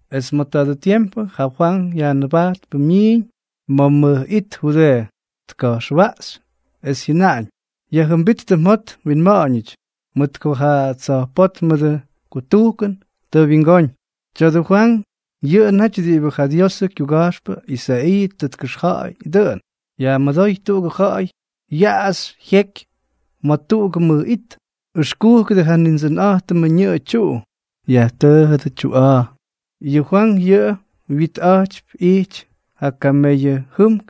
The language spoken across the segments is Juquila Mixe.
Es ma̱ tadʉ tiempʉ ja Fwank Yajnʉbajtpʉ myiiñ ma̱ mʉj it Judeeʉ, tka̱jxwaꞌxy, es jyʉnaꞌañ: —Yajjʉmbíttʉ mjot mwinma̱ꞌa̱ñʉty, mʉt ko ja tsa̱jpótmʉdʉ kutujkʉn tʉ wyingóñ. Tya̱dʉ Fwank yʉꞌʉ naty diꞌibʉ ja Diosʉ kyuga̱jxpʉ Isaiiʉ tʉ tkʉxja̱ꞌa̱y dʉꞌʉn: Yajmʉdóy tuꞌugʉ ja̱ꞌa̱y yaꞌaxy jyeky ma̱ tuꞌugʉ mʉj it: “Ʉxkúkʉdʉ ja Nindsʉnꞌa̱jtʉmʉ ñʉꞌʉ tyuꞌu. Yajtʉʉjʉdʉ tyuꞌa̱a̱.” Yʉ Fwank yʉꞌʉ wyitꞌa̱jtypy ijty ja kameyʉ jʉmk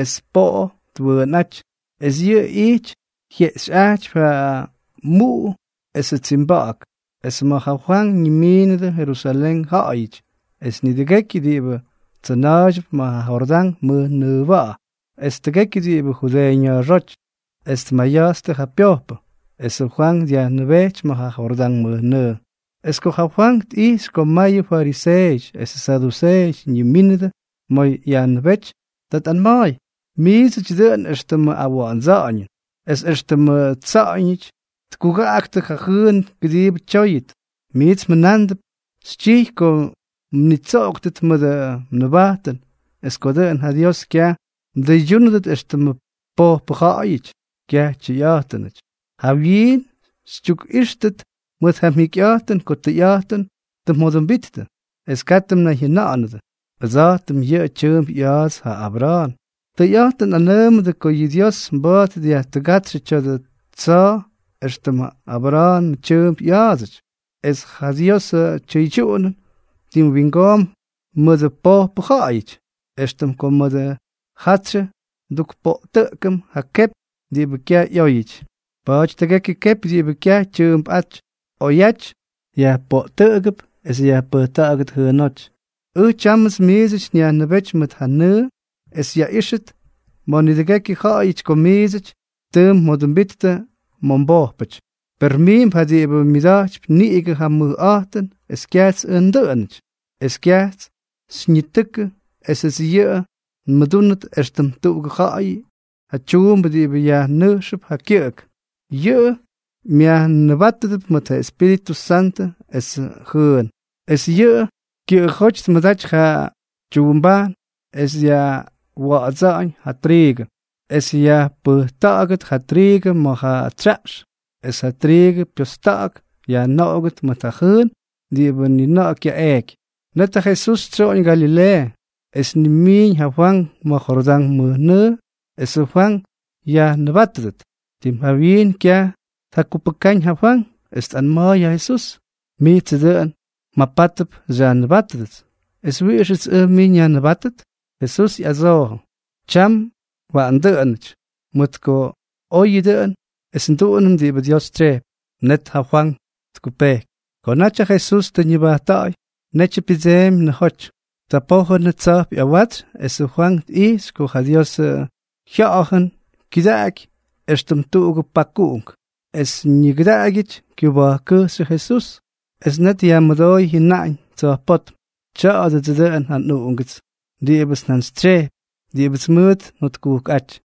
es poꞌo twʉʉnꞌáty, es yʉꞌʉ ijty jyeꞌxyꞌajtypy ja muꞌu esʉ tsimba̱ꞌa̱k. Es ma̱ ja Fwank ñimiinʉdʉ Jerusalén ja̱ꞌa̱yʉty es nidʉgekyʉ diꞌibʉ tsʉna̱a̱ydyʉp ma̱ ja Jordán mʉjnʉʉba̱ꞌa̱, es tʉgekyʉ diꞌibʉ Judeeʉ ña̱a̱xóty, es tmayatstʉ ja pyojpʉ. Esʉ Fwank dyajnʉbéty ma̱ ja Jordán mʉjnʉʉ. Es ko ja Fwank tꞌijxy ko mayʉ fariseeʉty esʉ saduseeʉty ñimínʉdʉ ma̱ yajnʉbéty, ta tꞌanma̱a̱y: —Miidsʉty dʉꞌʉn éxtʉmʉ awa̱ꞌa̱ndsa̱ꞌa̱ñʉn. Es éxtʉmʉ tsa̱ꞌa̱ñʉty tkugaꞌaktʉ ja jʉʉn kʉdiibʉ tyóyʉt, miits mjʉnándʉp xytyijy ko mnitsoꞌoktʉt mʉdʉ mnʉbajtʉn es ko dʉꞌʉn ja Dios kyaj mdʉydyúnʉdʉt éxtʉmʉ pojpʉ ja̱ꞌa̱yʉty. ¡Kyaj tyʉyꞌa̱jtʉnʉty! Jawyiin xytyukꞌíxtʉt mʉt ja mjikyꞌa̱jtʉn ko tʉyꞌa̱jtʉn tʉ mjodʉmbittʉ, es katʉ mnayjyʉna̱ꞌa̱nʉdʉ: “Ʉdsa̱jtʉm yʉꞌʉ tyʉʉmp ꞌya̱a̱ts ja Abra̱a̱n.” Tʉyꞌa̱jtʉn nꞌanʉʉmʉ ko yʉ Dios mba̱a̱t dyajtʉgátsyʉ tya̱dʉ tsa̱a̱ éxtʉm ja Abra̱a̱nʉ tyʉʉmp ꞌya̱a̱dsʉty. Es ja Diosʉ tyʉydyuꞌunʉn tim wingoomp mʉdʉ pojpʉ ja̱ꞌa̱yʉty, éxtʉm ko mʉdʉ jatsyʉ ndukpoꞌtʉꞌkʉm ja kepy diꞌibʉ kyaj ꞌyóyʉty. Pa̱a̱ty tʉgekyʉ kepy diꞌibʉ kyaj tyʉʉmpꞌáty oyaty, yajpoꞌtʉꞌʉgʉp es yajpʉjta̱ꞌa̱gʉt jʉʉnóty. Ʉj tyámʉts miidsʉty nyajnʉbéty mʉt ja nʉʉ es yaꞌíxʉt ma̱ nidʉgekyʉ ja̱ꞌa̱yʉty ko miidsʉty tʉ mjodʉmbittʉ ma̱ mbojpʉty. Per miimp ja diꞌibʉ myʉda̱jtypy niꞌigʉ ja mʉkꞌa̱jtʉn es kyajts ʉj ndʉꞌʉnʉty. Es kyajts xyñitʉkʉ esʉts yʉꞌʉ nmʉdúnʉt éxtʉm tuꞌugʉ ja̱ꞌa̱y ja tyuumbʉ diꞌibʉ yajnʉjxʉp ja kyʉꞌʉk. Yʉꞌʉ myajnʉbátʉdʉp mʉt ja Espíritʉ Santʉ esʉ jʉʉn. Es yʉꞌʉ kyʉꞌʉjóty tmʉdaty ja tyuumbajn es dyajwa̱ꞌa̱dsa̱ꞌa̱ñ ja triigʉ, es yajpʉjkʉꞌʉgʉt ja triigʉ ma̱ ja tsyaꞌx, es ja triigʉ pyosta̱ꞌa̱k yajnoꞌogʉt mʉt ja jʉʉn diꞌibʉ ni na̱ꞌa̱ kyaꞌeeky. Net ja Jesús tsyoꞌoñ Galileeʉ, es tnimiiñ ja Fwank ma̱ Jordán mʉjnʉʉ esʉ Fwank yajnʉbátʉdʉt. Tim jawyiin kyaj tjakupʉkáñ ja Fwank, es tꞌanma̱a̱y ja Jesús: —Mijtsʉ dʉꞌʉn mjapátʉp xyajnʉbátʉdʉts, ¿es wiꞌixʉts ʉj mij nyajnʉbátʉt? Jesús ꞌyadsoojʉ: —Tyam waꞌan dʉꞌʉnʉty, mʉt ko oyʉ dʉꞌʉn es nduꞌunʉm diꞌibʉ Dios tsyejpy. Net ja Fwank tkupejky. Ko naty ja Jesús tʉ ñʉbajtta̱ꞌa̱y, netyʉ pyʉdseemy nʉjoty. Ta pójʉnʉ tsa̱jp ꞌyawatsy esʉ Fwank tꞌijxy ko ja Diosʉ Jya̱ꞌa̱jʉn kyʉdaꞌaky éxtʉm tuꞌugʉ pakuꞌunk, es ñigʉdaꞌagyʉty kyʉba̱jkkʉjxyʉ Jesús. Es net yajmʉdooy jyʉnaꞌañ tsa̱jpótm: —Tya̱a̱dʉdsʉ dʉꞌʉn ja nꞌUꞌungʉts diꞌibʉts njantsytsyejpy, diꞌibʉts mʉʉt njotkujkꞌáty.